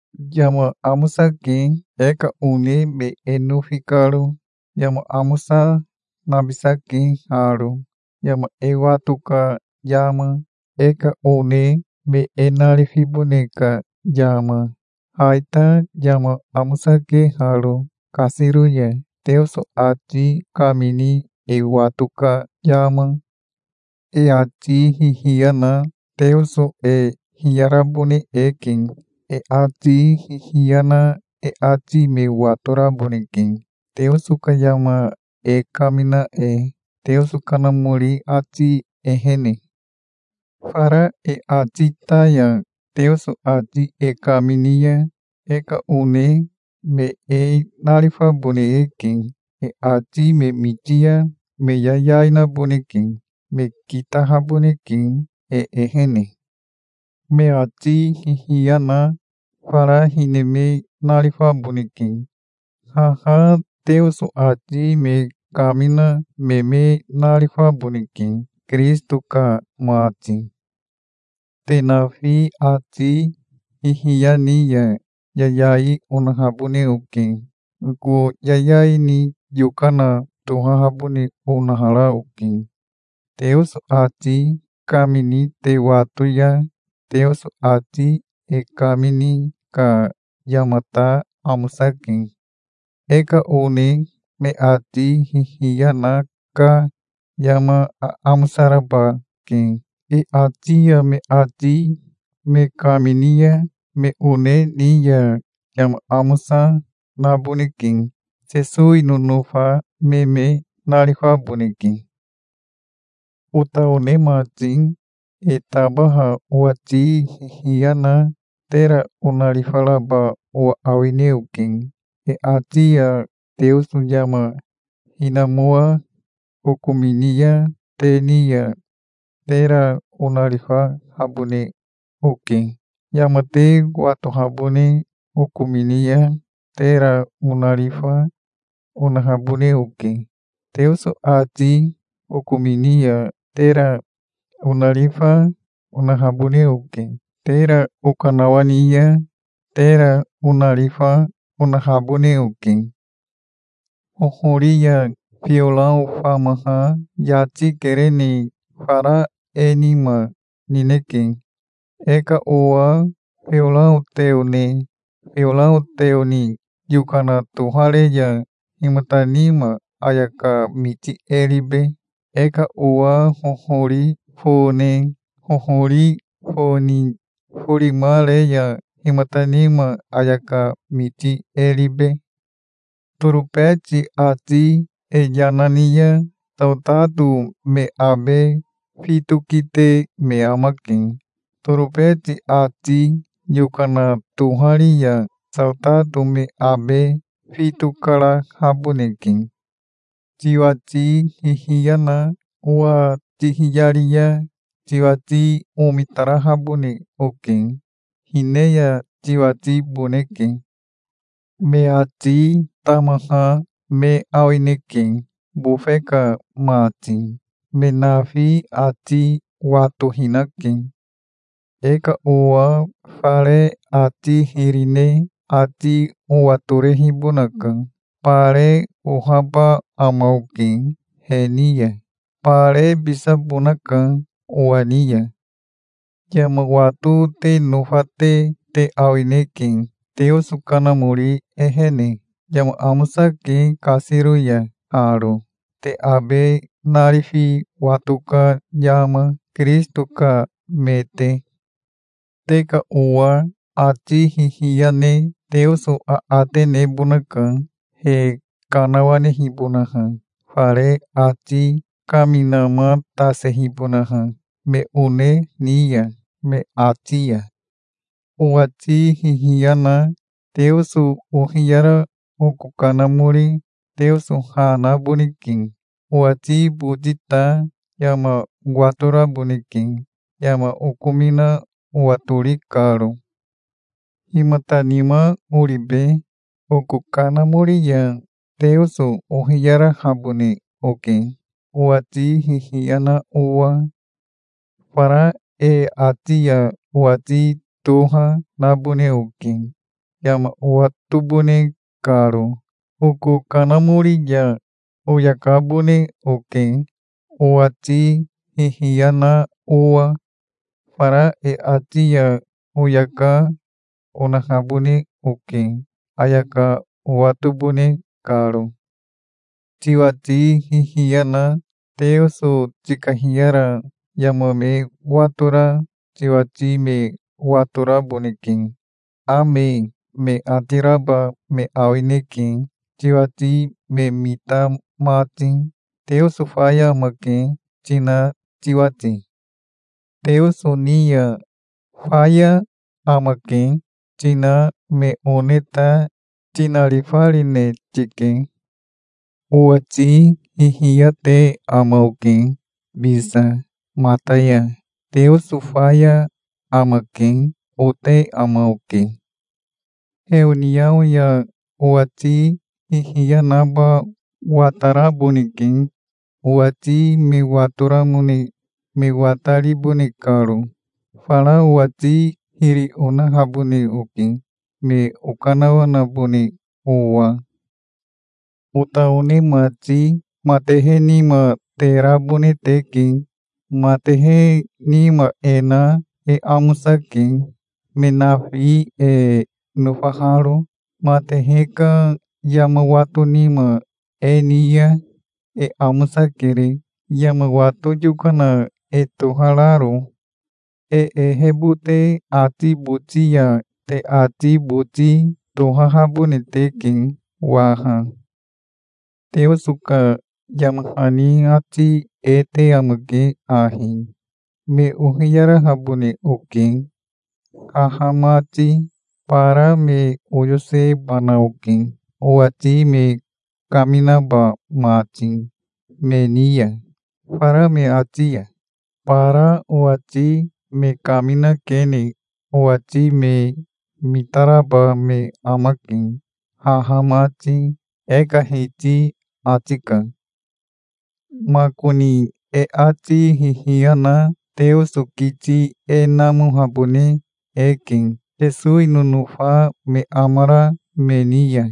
Yama amosake, e ka one me e nofi karo. Yama amosa nabisake haro, yama e wato ka yama, e ka one me e narifibone ka yama. Ha ita yama amosake haro kasiro ya, Teoso ati kamini e wato ka yama. E ati hihiya na Teoso e hiyarabone eke. E ati hihiya na e ati me watoraboneke, Teoso ka yama e kamina e, Teoso Kanamori ati ehene. Fara e ati ta ya Teoso ati e kamini ya e ka one me e narifabone eke. E ati me miti ya me yayai naboneke. Me kitahaboneke e ehene. Me ati hihiya na fara hine me narifaboneke. Haha Teoso ati me kamina me me narifaboneke, Kirisito ka mati. Te nafi ati hihiya ni ya yayai onahabone oke. Oko yayai ni yokana tohahabone onahara oke, Teoso ati kamini te wato ya. Teoso ati e kamini ka yama ta amosake. E ka one me ati hihiya na ka yama aamosa raba ke. E ati ya me ati me kamini ya me one ni ya yama amosa, naboneke. Sesowi nonofa me me narifaboneke. Ota one mati, e tabaha owati hihiya na tera onarifaraba owa awine oke. E ati ya Teoso yama hinamoa okomini ya te ni ya tera onarifahabone oke. Yama te watohabone okomini ya tera onarifa onahabone oke. Teoso ati okomini ya tera onarifa onahabone oke. Tera okanawani ya tera onarifa onahabone oke. Hohori ya fiorao famaha yati kerene fara e nima nineke. E ka owa fiorao teo ne fiorao teo ni yokana tohare ya himata nima ayaka miti e ribe? E ka owa hohori fo ne hohori fo ni forima re ya himata nima ayaka miti e ribe? Torobeti ati e yama ni ya saotato me abe fito kite me amake. Torobeti ati yokana tohari ya saotato me abe fito karahaboneke. Tiwati hihiya na owa tihiyari ya tiwati omitarahabone oke. Hine ya tiwatiboneke. Me ati tamaha me awineke, bofe ka mati. Me nafi ati watohinake. E ka owa fare ati hiri ne ati owatorehibonaka. Bare ohaba ama oke he ni ya. Barebisabonaka owa ni ya. Yama wato te nofate te awineke, Teoso Kanamori ehene. Yama amosake kasiro ya haro, te abe narifi wato ka yama, Kirisito ka me te. Te ka owa ati hihiya ne Teoso aate nebonaka, he kanawanehibonaha, fare ati kaminamatasehibonaha me one ni ya me ati ya. Owati hihiya na Teoso ohiyara oko kanamori Teoso ha naboneke. Owati boti ta yama watoraboneke, yama okomina owatori karo. Himata nima oribe? Oko kanamori ya Teoso ohiyarahabone oke, owati hihiya na owa. Fara e ati ya owati toha nabone oke, yama owatobone karo. Oko kanamori ya oyakabone oke, owati hihiya na owa. Fara e ati ya oyaka onahabone oke, ayaka owatobone karo. Tiwati hihiya na Teoso tikahiyara yama me watora tiwati me watoraboneke. "Ame", me ati raba me awineke, tiwati me mita mati, "Teoso faya amake", tina tiwati. Teoso ni ya "Faya amake", tina me one ta tinarifarine tike. Owati hihiya te ama oke bisa, mata ya. "Teoso faya amake", ote ama oke. Heoniao ya owati hihiya naba wataraboneke, owati me watoramone me wataribone karo. Fara owati hiri onahabone oke, me okanawanabone owa. Ota one mati, matehe nima te rabone teke. Matehe nima e na e amosake, me nafi e nofaharo. Matehe ka yama wato nima e ni ya e amosakere, yama wato yokana e tohararo. E ehebote ati boti ya te ati boti tohahabone teke waha. Teoso ka yama hani ati e te amake ahi: "Me ohiyarahabone oke, haha mati. Bara me oyosebana oke, owati me kaminaba mati me ni ya, fara me ati ya. Bara owati me kaminakene owati me mitaraba me amake, haha mati", e ka Hiti ati ka. Makoni e ati hihiya na Teoso kiti e namohabone eke, Sesowi nonofa me amara me ni ya.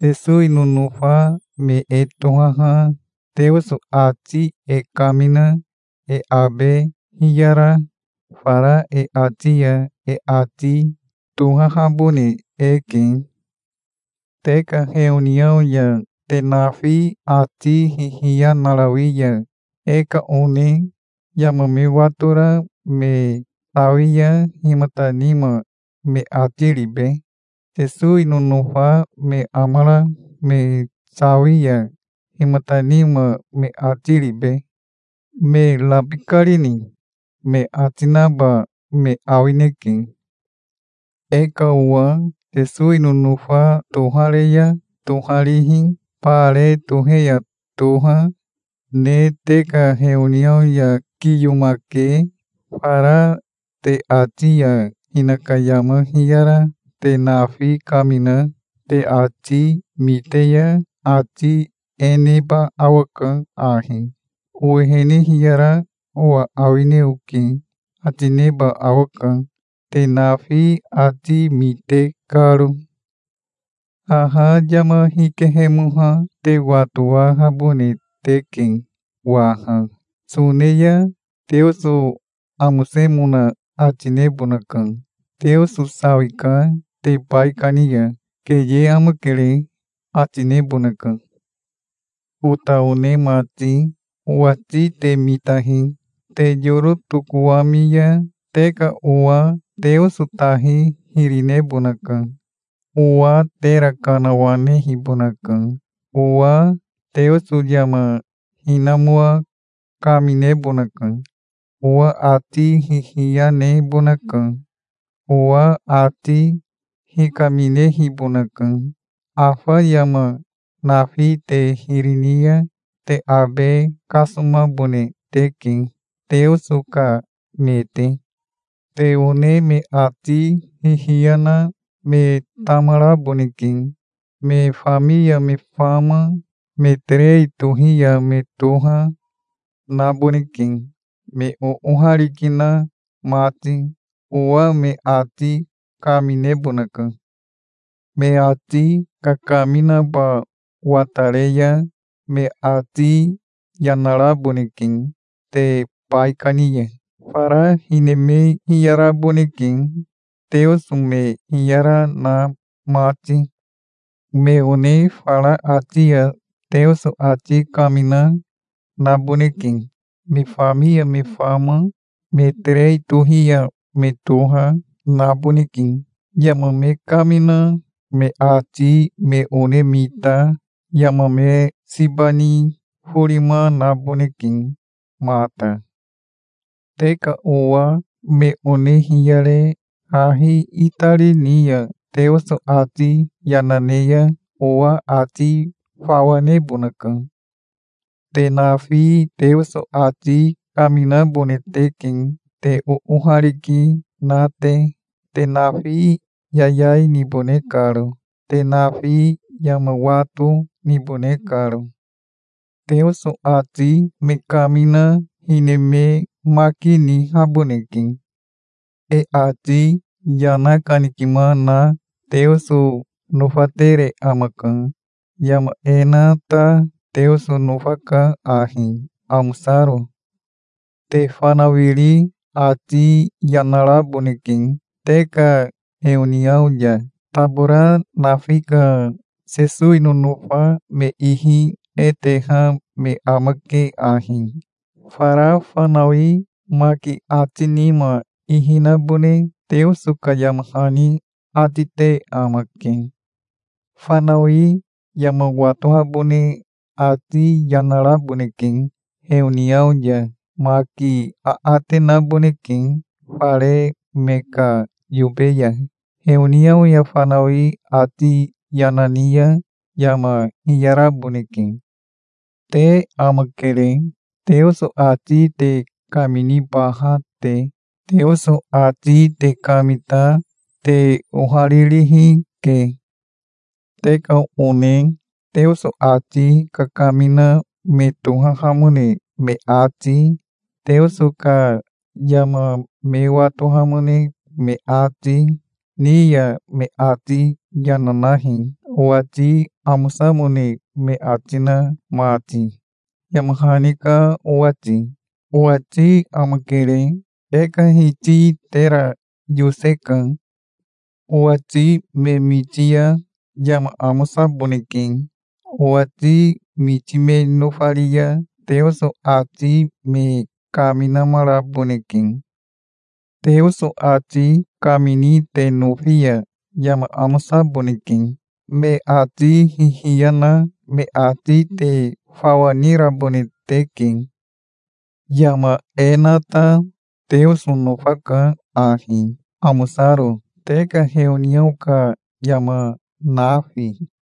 Sesowi nonofa me e tohaha Teoso ati e kamina e abe hiyara, fara e ati ya e ati tohahabone eke. Te ka heoniao ya te nafi ati hihiya narawi ya e ka one yama me watora me sawi ya himata nima me ati ribe? Sesowi nonofa me amara me sawi ya himata nima me ati ribe? "Me rabikarini?" me ati naba me awineke. E ka owa Sesowi nonofa tohare ya toharihi, bare tohe ya toha, ne te ka heoniao ya kiyomake fara te ati ya hinaka yama hiyara te nafi kamina te ati mite ya ati e neba awaka ahi: "Owehene hiyara owa awine oke", ati neba awaka, te nafi ati mite karo. Haha yama hikehemoha te watowahabone teke waha. Sone ya Teoso amosemona ati nebonaka. "Teoso sawika te baikani ya. Keye amakere", ati nebonaka. Ota one mati, owati te mitahi. Te yoro tokowami ya te ka owa Teoso tahi hiri nebonaka. Owa tera kanawanehibonaka. Owa Teoso yama hinamoa kaminebonaka. Owa ati hihiya nebonaka. Owa ati hikaminehibonaka. Afa yama nafi te hiri ni ya te abe kasomabone teke, Teoso ka me te. Te one me ati hihiya na me tamaraboneke. Me fami ya me fama, me terei tohi ya me toha, naboneke, me oohariki na mati. Owa me ati kaminebonaka. Me ati kakaminaba watare ya me ati yana raboneke te baikani ya. Fara hine me hiyaraboneke, Teoso me hiyara na mati. Me one fara ati ya Teoso ati kamina, naboneke. Me fami ya me fama, me terei tohi ya me toha, naboneke. Yama me kamina me ati me one mita yama me siba ni forima naboneke mata. Te ka owa me one hiyare hahi itari ni ya Teoso ati yana ne ya owa ati fawa nebonaka. Te nafi Teoso ati kaminabone teke te oohariki na te, te nafi yayai nibone karo, te nafi yama wato nibone karo. Teoso ati me kamina hine me maki nihaboneke. E ati yana kanikima na Teoso nofatere amaka. Yama e na ta Teoso nofaka ahi amosaro. Te fanawiri ati yana raboneke te ka heoniao ya. Tabora nafi ka Sesowi nonofa me ihi e teha me amake ahi. Fara fanawi maki ati nima ihi nabone Teoso ka yama hani ati te amake. Fanawi yama watohabone ati yana raboneke heoniao ya. Maki aate naboneke fare me ka yobe ya. Heoniao ya fanawi ati yana ni ya yama hiyaraboneke. Te amakere, Teoso ati te kaminibaha te. Teoso ati te kamita te oharirihi ke. Te ka one Teoso ati kakamina me tohahamone me ati, Teoso ka yama me watohamone me ati, ni ya me ati yana nahi, owati amosamone me ati na mati, yama hani ka owati. Owati amakere. E ka Hiti tera yoseka. Owati me miti ya yama amosaboneke. Owati miti me nofari ya Teoso ati me kaminamaraboneke. Teoso ati kamini te nofi ya yama amosaboneke. Me ati hihiya na me ati te fawa nirabone teke. Yama e na ta Teoso nofaka ahi amosaro, te ka heoniao ka yama nafi.